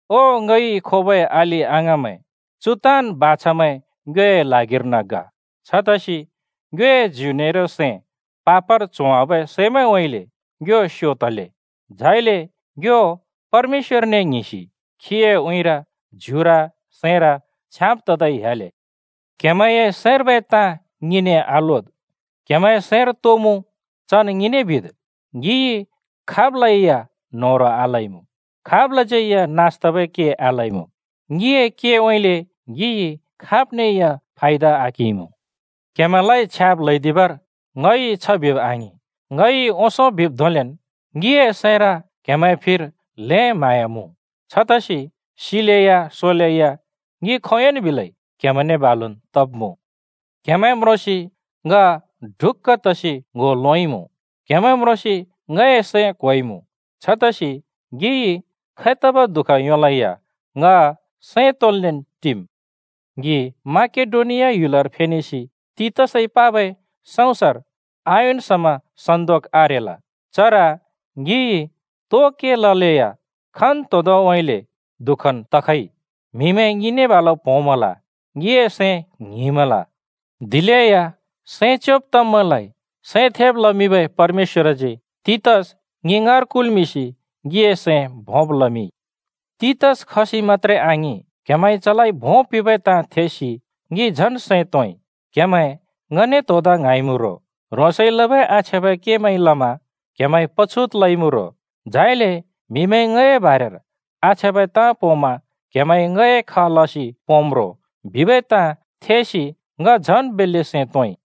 ओ ङइ खोबै अलि-अङाँमैं, चु ताँन् बाछामैं ङ्योए ल्हागिर्न ग। छतसि ङ्योए ज्यु नेरो सैं पापर च्होवाबै सैमैंउँइँले ङ्यो स्‍यो तले। झाइले ङ्यो परमेश्‍वरने ङ्हिंसि खीए उँइँर ज्युर सैंर छ्याँब् ततै ह्‍याले। क्हेमैंए सैंर्बै ताँ ङिने आलोद्, क्‍हेमैंए सैंर तो मुँ चन् ङिने बिद्। ङिइ खाबलै या न्होह्रों आलइमुँ, खाबलाज्यै या नास तबै के आलइमुँ। ङिए केउँइँले ङिइ खाब्ने या फायदा आकिंइमुँ। क्‍हेमैंलाइ छ्याब् ल्हैदिबर ङइ छ बिब आङिं। ङइ ओंसों बिब् धोंलेन्, ङिए सैंर क्हेमैंए फिर ल्हें म्हाँया मुँ, छतसि सिलेया सोलेया ङि खोंयोंन् बिलै क्‍हेमैंने बालुन् तब्मुँ। क्‍हेमैं म्रोंसि ङ ढुक्‍का तसि ङ्‍हो लोंइँमुँ। क्हेमैं म्रोंसि ङए सैं क्होइमुँ। छतसि ङिइ खैतबै दुःख योंलेया ङ सैं तोंन्लेन् टिम्। ङि माकेडोनिया ह्‍युलर फेनेसि तीतसइ पबै सँउँसर आयोंन् समा सन्‍दोक आरेल। चर ङिइ तो के ललेया खन्तोंदोंउँइँले दुःखन् तखइ, म्हिमैं ङिने प्‍होंमल, ङिए सैं ङ्हिंमल। दिलेया सैं च्‍योंब तब्‍मैंलाइ सैं थेब् लमिंबै परमेश्‍वरजी तीतस ङि ङाँर कुल्मिंसि ङिए सैं भोंब् लमिंइ। तीतस खसि मत्‍त्रे आङिं, क्‍हेमैंइ चलाइ भों पिंबै ताँ थेसि ङि झन् सैं तोंइ। क्‍हेमैं ङने त्‍होदा ङ्हाँइमुँ रो, ह्रोंसइ लबै आछ्याँबै केमैंइ लमा क्हेमैंइ पछुत लइमुँ रो, झाइले म्हिमैंइ ङए बारेर आछ्याँबै ताँ पोंमा क्‍हेमैंइ ङए ख लसि पोंम् रो बिबै ताँमैं थेसि ङ झन् बेल्‍ले सैं तोंइ।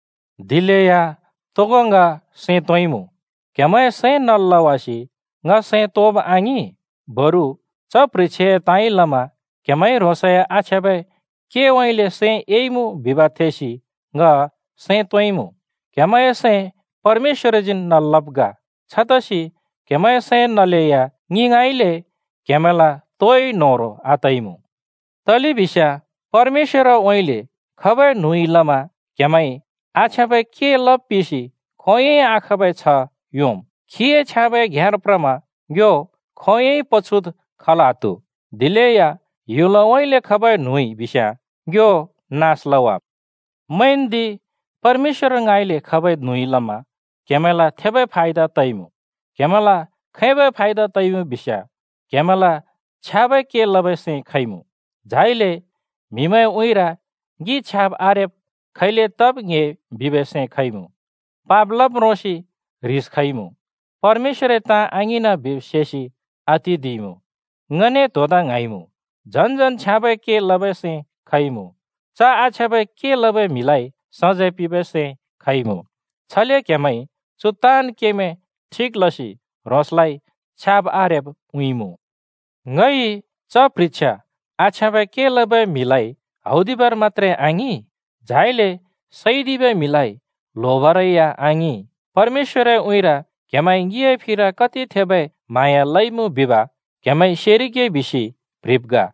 दिलेया तोगो ङ सैं तोंइमुँ। क्‍हेमैंए सैं नल् लवासि ङ सैं तोंब आङिं, बरु च प्ह्रिछ्याए ताँइ लमा क्‍हेमैंइ ह्रोंसए आछ्याँबै केउँइँले सैं एइमुँ बिब् थेसि ङ सैं तोंइमुँ। क्हेमैंए सैं परमेश्‍वरजीन् नल् लब् ग, छतसि क्‍हेमैंए सैं नलेया ङि ङाँइँले क्‍हेमैंला तोइ न्होह्रों आतइमुँ। तलेबिस्याँ परमेश्‍वरउँइँले खबै न्हुँइ लमा क्हेमैंइ आछ्याँबै के लब् पिसि खोंयोंइ आखाँबै छ्ह योंम्। खीए छ्याँबै घ्‍याँर प्रमा ङ्यो खोंयोंइ पछुत् खल् आत्‍हु। दिलेया ह्‍युलउँइँले खबै न्हुँइ बिस्याँ ङ्यो नास लवाम्। मैंन्दि, परमेश्‍वर ङाँइले खबै न्हुँइ लमा क्‍हेमैंला थेबै फायदा तइमुँ! क्‍हेमैंला खैबै फायदा तइमुँ बिस्‍याँ: क्‍हेमैंला छ्याँबै के लबै सैं खइमुँ, झाइले म्हिमैंए उँइँर “ङि छ्याब् आरेब्” खैले तब् ङ्‍हे बिबै सैं खइमुँ, पाप लब् म्रोंसि ह्रिस खइमुँ, परमेश्‍वरए ताँ आङिंना बिब् सेसि आतिदिइमुँ, ङने त्‍होदा ङ्हाँइमुँ, झन् झन् छ्याँबै के लबै सैं खइमुँ, च आछ्याँबै के लबै म्हिलाइ सजैं पिंबै सैं खइमुँ। छले क्‍हेमैंइ चु ताँन् केमैं ठिक लसि ह्रोंसलाइ छ्याब आरेब् उँइँइमुँ। ङइ च प्ह्रिछ्या आछ्याँबै के लबै म्हिलाइ हौदिबर मत्‍त्रे आङिं, झाइले सैदिबै म्हिलाइ ल्होबरै या आङिं, परमेश्‍वरए उँइँर क्हेमैंइ ङिए फिर कति थेबै म्हाँया लइमुँ बिब क्हेमैंइ सेरिगे बिसि प्‍ह्रिब् ग।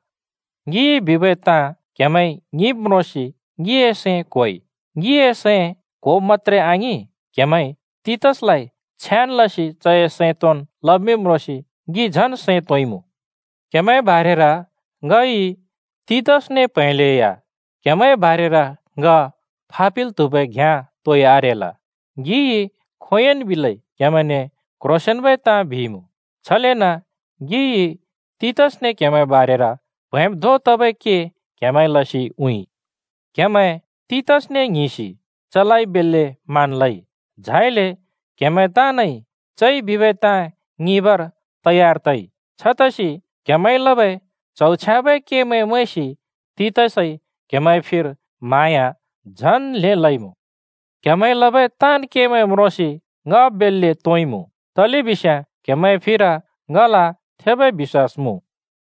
ङिइ बिबै ताँ क्हेमैंइ ङिंब् म्रोंसि ङिए सैं क्‍होइ। ङिए सैं क्‍होब मत्‍त्रे आङिं, क्‍हेमैंइ तीतसलाइ छ्याँन् लसि चए सैं तोंन् लमिंब् म्रोंसि ङि झन् सैं तोंइमुँ। क्‍हेमैंए बारेर ङइ तीतसने प्हैंलेया क्‍हेमैंए बारेर ङ फापिल् त्हुबै घ्याँ तोइ आरेल। ङिइ खोंयोंन् बिलै क्‍हेमैंने क्‍ह्रोंसेंन्‍बै ताँ बिइमुँ। छलेन ङिइ तीतसने क्‍हेमैंए बारेर प्हैंब् धों तबै के क्‍हेमैंइ लसि उँइँइ। क्‍हेमैं तीतसने ङ्हिंसि चलाइ बेल्‍ले मान लइ, झाइले क्‍हेमैं ताँनइ चइ बिबै ताँ ङिंबर तयार तइ। छतसि क्‍हेमैंइ लबै च्हौ छ्याँबै केमैं मैंसि तीतसइ क्हेमैंए फिर म्हाँया झन् ल्हें लइमुँ। क्‍हेमैंइ लबै ताँन् केमैं म्रोंसि ङ बेल्‍ले तोंइमुँ, तलेबिस्याँ क्हेमैंए फिर ङल थेबै बिश्‍वास मुँ।